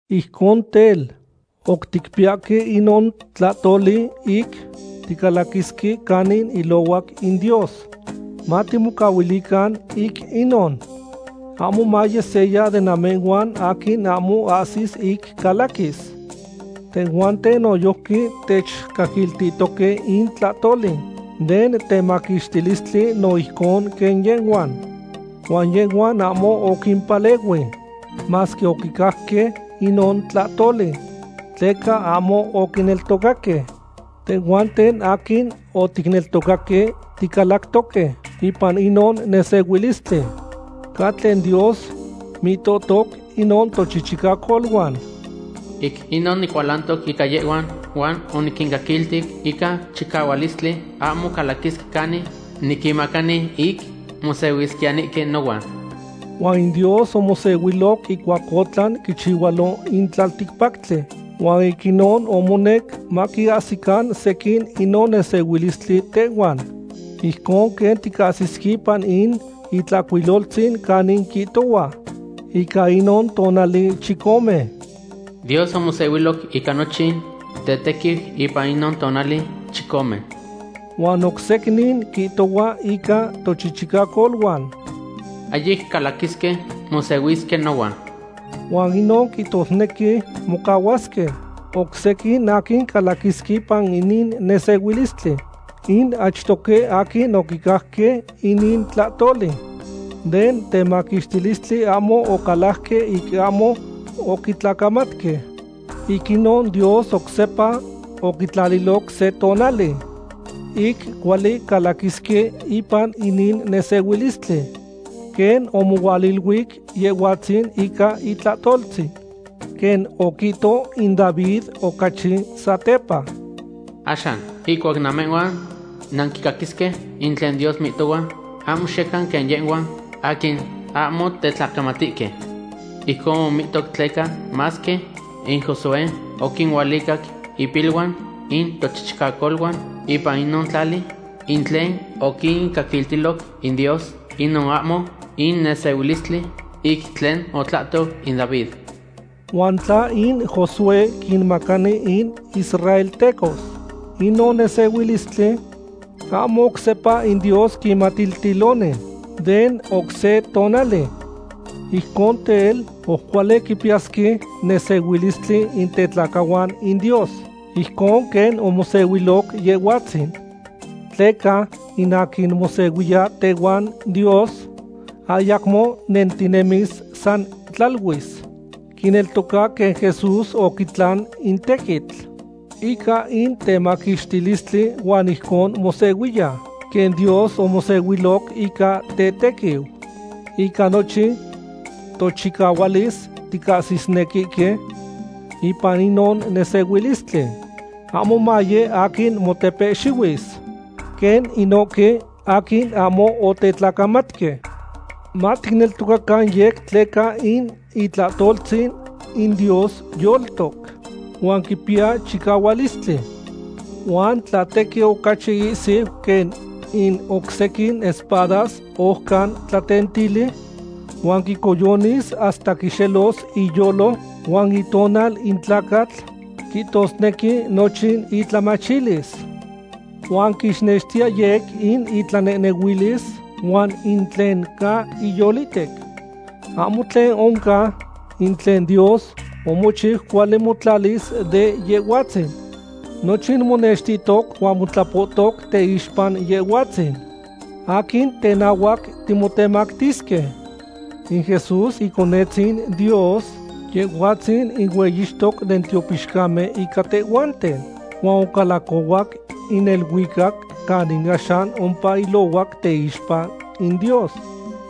Ijcon tel, oc ticpiyahque inon tlahtoli ic ticalaquisque canin ilohuac in Dios, matimomaluican ic inon, ahmo maye seya de namehhuan aquin ahmo ahsi ic calaquis. Tehhuanten noyojqui techcaquiltihtoque in tlahtoli den temaquixtilistli no ijcon quen yehhuan. Huan yehhuan ahmo oquimpalehui, masque oquicajque inon tlahtoli, tleca ahmo oquineltocaque. Tehhuanten aquin oticneltocaque ticalactoque ipan inon nesehuilistli. Ca tlen Dios mihtohtoc inon tochichicacoluan: Ic inon nicualantoc ica yehhuan, huan oniquincaquilti ica chicahualistli, ahmo calaquisque canin niquinmacani ic mosehuisquiyanihque nohuan. Huan in Dios omosehuiloc ihcuac otlan quichihualo in tlalticpactli, huan ic inon omonec maquiahsican sequin inon nesehuilistli tehuan. Ijcon quen ticahsisque ipan in Itlahcuiloltzin canin quihtohua ica inon tonali chicome: Dios omosehuiloc ica nochin tetequiu ipan inon tonali chicome. Huan oc secnin quihtohua ica tochichicacoluan: Ahyic calaquisque mosehuisque nohuan. Huan inon quihtosnequi mocahuasque oc sequin aquin calaquisque ipan inin nesehuilistli. In achtoque aquin oquicajque inin tlahtoli den temaquixtilistli ahmo ocalajque ic ahmo oquitlacamatque. Ic inon Dios oc sepa oquitlaliloc se tonali ic cuali calaquisque ipan inin nesehuilistli, quen omohualiluic Yehhuatzin ica itlahtoltzin quen oquihto in David ocachi satepa: Axan, ihcuac namehhuan nanquicaquisque in tlen Dios mihtohua, ahmo xiyecan quen yehhuan aquin ahmo tetlacamatihque. Ijcon omihto tleca masque in Josué oquinualicac impiluan in tochichicacoluan ipan inon tlali in tlen oquincaquiltiloc in Dios, inon ahmo in nesehuilistli ic tlen otlahto in David. Huan tla in Josué quinmacani in israeltecos inon nesehuilistli, ahmo oc sepa in Dios quimatiltiloni den oc se tonali. Ijcon tel, oc cuali quipiyasque nesehuilistli in tetlacahuan in Dios ijcon quen omosehuiloc Yehhuatzin. Tleca in aquin mosehuiya tehuan Dios, ayacmo nentinemis san tlaluis. Quineltoca quen Jesús oquitlan in tequitl ica in temaquixtilistli huan ijcon mosehuiya quen Dios omosehuiloc ica tetequiu. Ica nochin tochicahualis ticahsisnequihque ipan inon nesehuilistli, ahmo maye aquin motepehxihuis quen inohque aquin ahmo otetlacamatque. Maticneltocacan yec tleca in itlahtoltzin in Dios yoltoc huan quipiya chicahualistli, huan tlatequi ocachi ihsiu quen in oc sequin espadas ojcan tlatentili. Huan quicoyonis hasta quixelos iyolo huan itonal in tlacatl, quihtosnequi nochin itlamachilis. Huan quixnextiya yec in itlanehnehuilis huan in tlen ca iyolihtec. Ahmo tlen oncan in tlen Dios omochiu cuali motlatis de Yehhuatzin. Nochin monextihtoc huan motlapoutoc teixpa Yehhuatzin aquin tenahuac timotemactisque. In Jesús Iconetzin Dios, Yehhuatzin in hueyixtoc den tiopixcamen ica tehhuanten huan ocalacohuac in neluicac canin axan ompa ilohuac teixpa in Dios.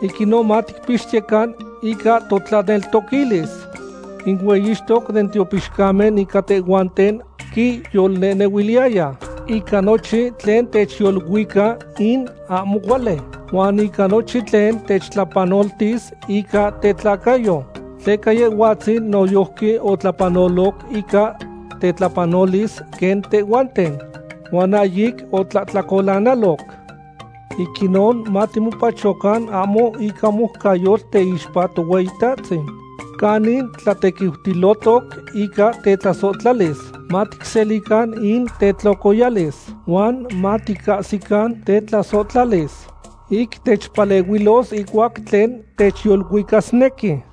Ic inon maticpixtiyecan ica totlaneltoquilis. In hueyixtoc den tiopixcamen ica tehhuanten quiyolnehnehuiliya ica nochin tlen techyoluica in ahmo cuali huan ica nochin tlen techtlapanoltis ica tetlacayo, tleca Yehhuatzin noyojqui otlapanoloc ica tetlapanolis quen tehhuanten, huan ahyic otlahtlacolanaloc. Ic inon matimopachocan ahmo ica moucayotl teixpa Tohueyitatzin canin tlatequiutilotoc ica tetlasohtlalis, maticselican in tetlocoyalis huan maticahsican tetlasohtlalis ic techpalehuilos ihcuac tlen techyoluicasnequi.